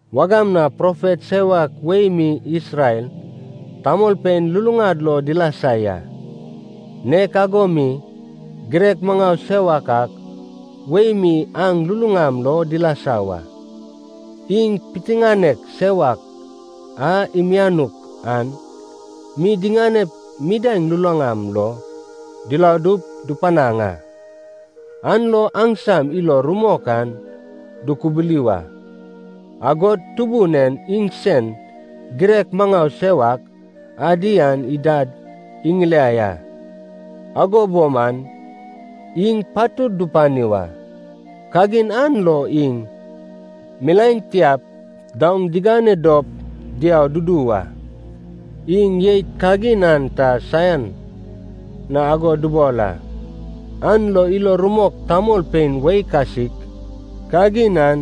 Wagam na profet sewak wei mi Isrel tamolpein luluŋad lo dilasa ya. Nek ago mi girek maŋau sewak ak wei mi aŋ luluŋam lo dilasa wa. Iŋ piteŋanek sewak a imianuk an mi diŋanep midaeŋ luluŋam lo diladup dupanaŋ a, an lo aŋsam ilo rumok an dukubuli wa. Agod Tubun en iŋsen girek maŋau sewak adi an idad iŋiliai a, ago bo man iŋ patud dupani wa. Kagin an lo iŋ milaen tiap daoŋ diŋane dop diau dudu wa. Iŋ jeit kagin an ta saian na ago dubol a, an lo ilo rumok tamolpein wei kasik kagin an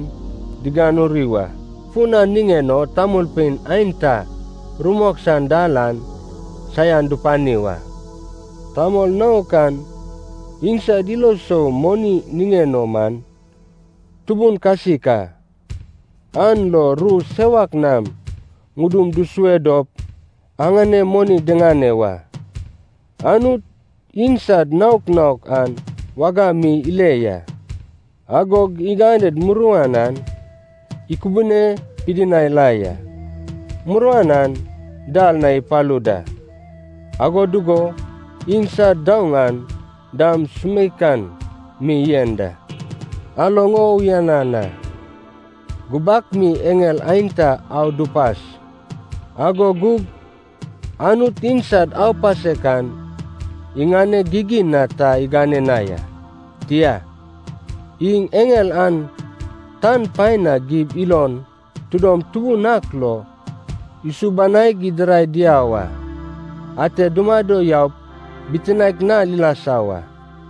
diganuri wa. Fun an niŋen o tamolpein aenta rumok san dal an saian dupani wa. Tamol naok an iŋsad ilo sou moni niŋen o man tubun kasik a, an lo ru sewak nam ŋudum dusue dop aŋanem moni diŋane wa. Anut iŋsad naok naok an wagam mi ile ya, agog iŋaned muruan an ikubune pidinai la ya. Muruan an dal na ipalu da, ago dugo iŋsad daoŋ an dam sumeikan mi yen da. Aloŋ o uyanan a. Gubak mi eŋel aenta au dupas, ago gug Anut iŋsad aupasek an iŋaneg gigin na ta igane na ya. Tia, iŋ eŋel an tan paen na gib ilon tidom tubun ak lo isubanaig idirai diau a. Ate dumado yaup bitinaek nal ilasa wa.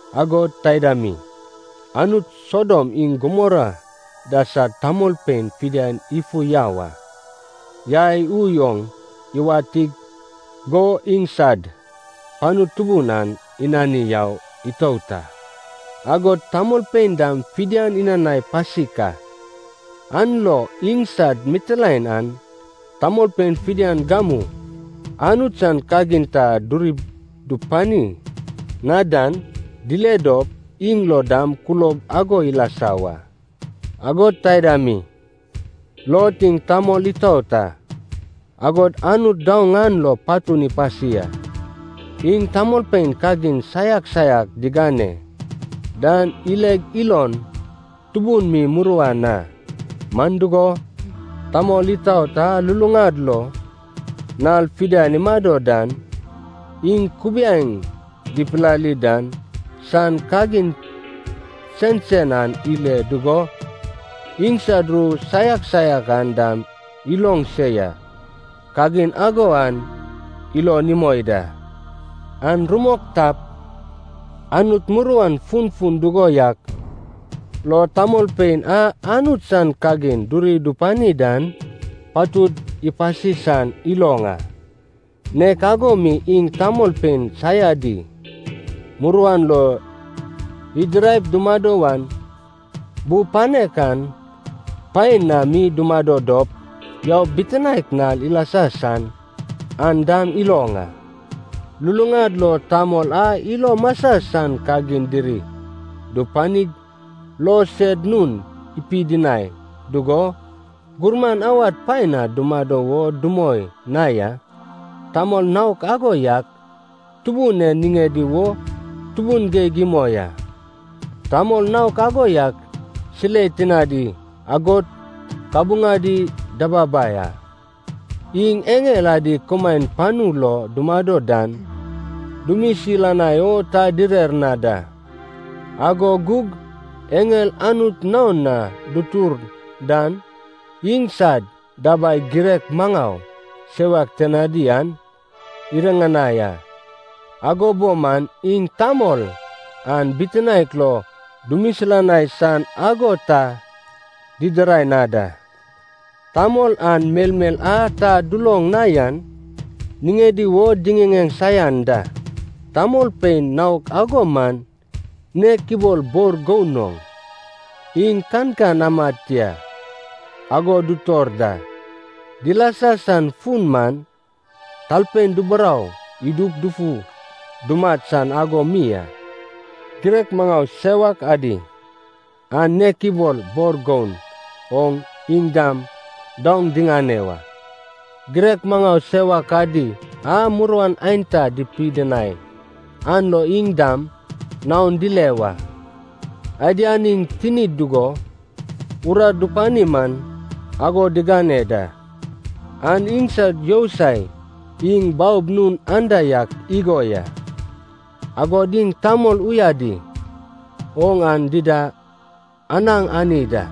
Agod taida mi, Anut Sodom iŋ Gumora da sad tamolpein fidian ifu yau a. Yai ui oŋ iwatik go iŋsad panu tubun an inani yau itout a, agod tamolpein dam fidian inanai pasik a. An lo iŋsad mitilaen an tamolpein fidian gamu Anut san kagin ta duri dupani na dan dile dop, iŋ lo dam kulob ago ilasa wa. Agod taida mi, Lot iŋ tamol itaot a, agod Anut daoŋ an lo patun ipasi a. Iŋ tamolpein kagin saiak saiak digane dan ileg ilon tubun mi muruan a. (Man dugo, tamol itaot a luluŋad lo nal fidian imado dan, iŋ kubiaeŋ dipilali dan san kagin sensen an ile dugo iŋsad ru saiak saiak an dam iloŋ se ya. Kagin ago an ilon imoi da.) An rumok tap, Anut muruan funfun dugo yak lo tamolpein a Anut san kagin duri dupani dan patud ipasi san iloŋ a. Nek ago mi iŋ tamolpein saiadi muruan lo idiraip dumado wan bu panek an paen na mi dumado dop yaup bitinaek nal ilasa san, an dam iloŋ a. Luluŋad lo tamol a ilo masa san kagin diri dupanig lo sed nun ipidinai dugo, gurman awad paen na dumado wo dumoi na ya, tamol naok ago yak Tubun en niŋedi wo tubun geig imoi a. Tamol naok ago yak silei tinadi agod kabuŋadi dababai a. Iŋ eŋel adi kumaen panu lo dumado dan dumisilanai o ta direr na da. Ago gug eŋel Anut naon na dutur dan iŋsad dabai girek maŋau sewak tinadi an iriŋanai a, ago bo man iŋ tamol an bitinaek lo dumisilanai san ago ta didirai na da. Tamol an melmel a ta duloŋ na yan niŋedi wo diŋiŋeŋ saian da. Tamolpein naok ago man nek ibol bor goun oŋ, iŋ kankan amad tia ago dutor da, dilasa san fun man talpein duburou idup dufu dumat san ago mi a. Girek maŋau sewak adi an nek ibol bor goun oŋ iŋ dam daoŋ diŋane wa. Girek maŋau sewak adi a muruan aenta dipidinai an lo iŋ dam naon dile wa. Adian iŋ tinid dugo urat dupani man ago digane da, an iŋsad yousai. Iŋ baob nun anda yak igo ya. Agod iŋ tamol uyadi oŋ aŋ dida anaŋ ani da.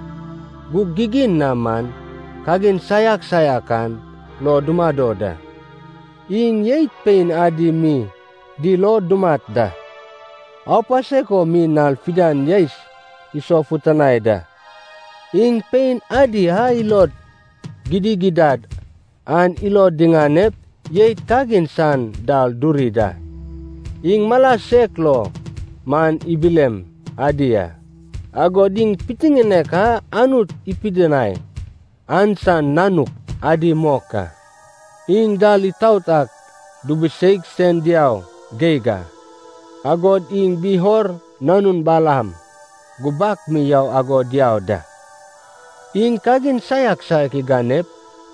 Gug gigin na man kagin saiak saiak an lo dumado da. Iŋ jeit pein adi mi dil o dumat da. Aupasek o mi nal fidian yaes isofutanai da. Iŋ pein adi a ilod gidigidad an ilod diŋanep jeit kagin san dal duri da. Iŋ mala sek lo man ibilem adi a, agod iŋ pitiŋinek a Anut ipidinai an san nanuk adi mok a. Iŋ dal itaot ak dubiseig sen diau geig a, agod iŋ Beor nanun Balaam gubak mi yau ago diau da. Iŋ kagin saiak saiak iganep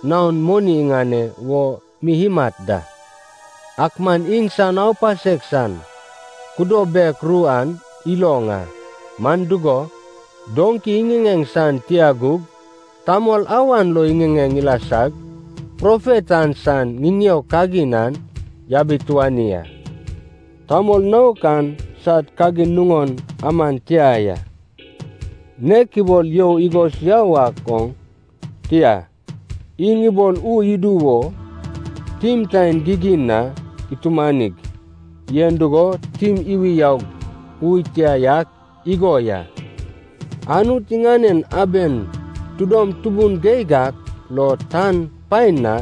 naon moni iŋane wo mi imat da. Ak man iŋsan aupasek san kudo bek ru an iloŋ a. Man dugo, doŋki iŋiŋeŋ san tia gug tamol awan lo iŋiŋeŋ ilasag profet an san ŋiŋeo kagin an yabituani a. Tamol naok an sad kagin nuŋon aman tia ya, nek ibol you igos yau ak oŋ, tia, iŋ ibol ui idu wo tim taen gigin na itumanig yen dugo tim iwi yaug ui tia yak igo ya. Anut iŋaned aben tidom tubun geig ak lo tan paen na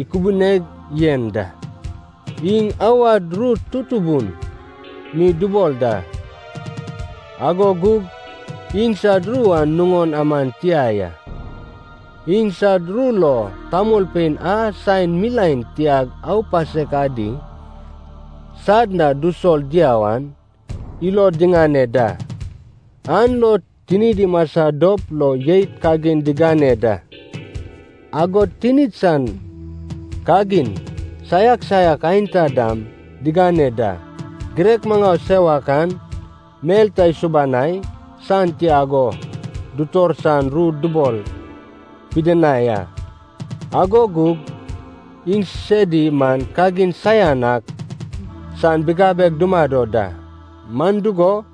ikubuneg yen da. Iŋ awad ru tutubun mi dubol da, ago gug iŋsad ru an nuŋon aman tia ya. Iŋsad ru lo tamolpein a saen milaen tiag aupasek adi sad na dusol diau an ilod diŋane da, an lo tinid imasa dop lo jeit kagin digane da, agod tinid san kagin saiak saiak aenta dam digane da. Girek maŋau sewak an mel ta isubanai san tia ago dutor san ru dubol pidinai a. Ago gug iŋsedi man kagin saian ak san bigabeg dumado da. Man dugo,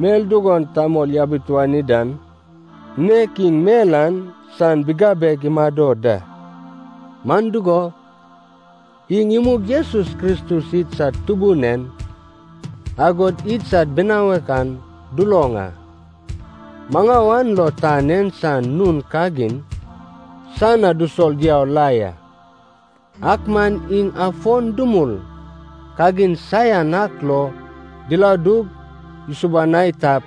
mel dugon tamol yabituani dan, nek iŋ mel an san bigabeg imado da. Man dugo, iŋ imug Jesus Kristus idsad Tubun en, agod idsad binawek an duloŋ a, maŋau an lo tan en san nun kagin san na dusol diau la ya. Ak man iŋ afon dumul kagin saian ak lo diladug isubanai tap,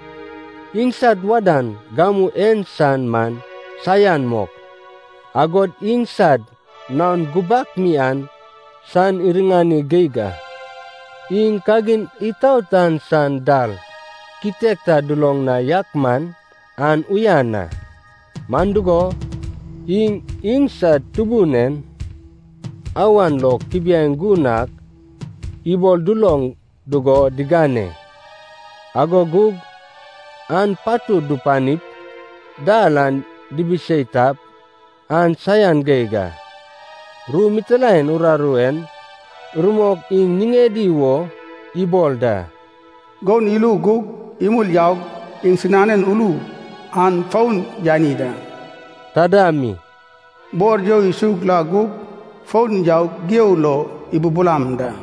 iŋsad wadan gamu en san man saian mok, agod iŋsad naon gubak mi an san iriŋani geig a. Iŋ kagin itaot an san dal kitek ta duloŋ na yak man, an uyan a. Man dugo, iŋ iŋsad Tubun en awan lo kubiaeŋ gun ak ibol duloŋ dugo diŋane, ago gug an patud dupanip dal an dibisei tap, an saian geig a. Ru mitilaen uraru en rumok iŋ niŋedi wo ibol da, “goun ilu gug imul yaug iŋsinanen ulu an fon yani da,” taida mi, “bor you isug la gug fon yaug gigeo lo ibubulam da.”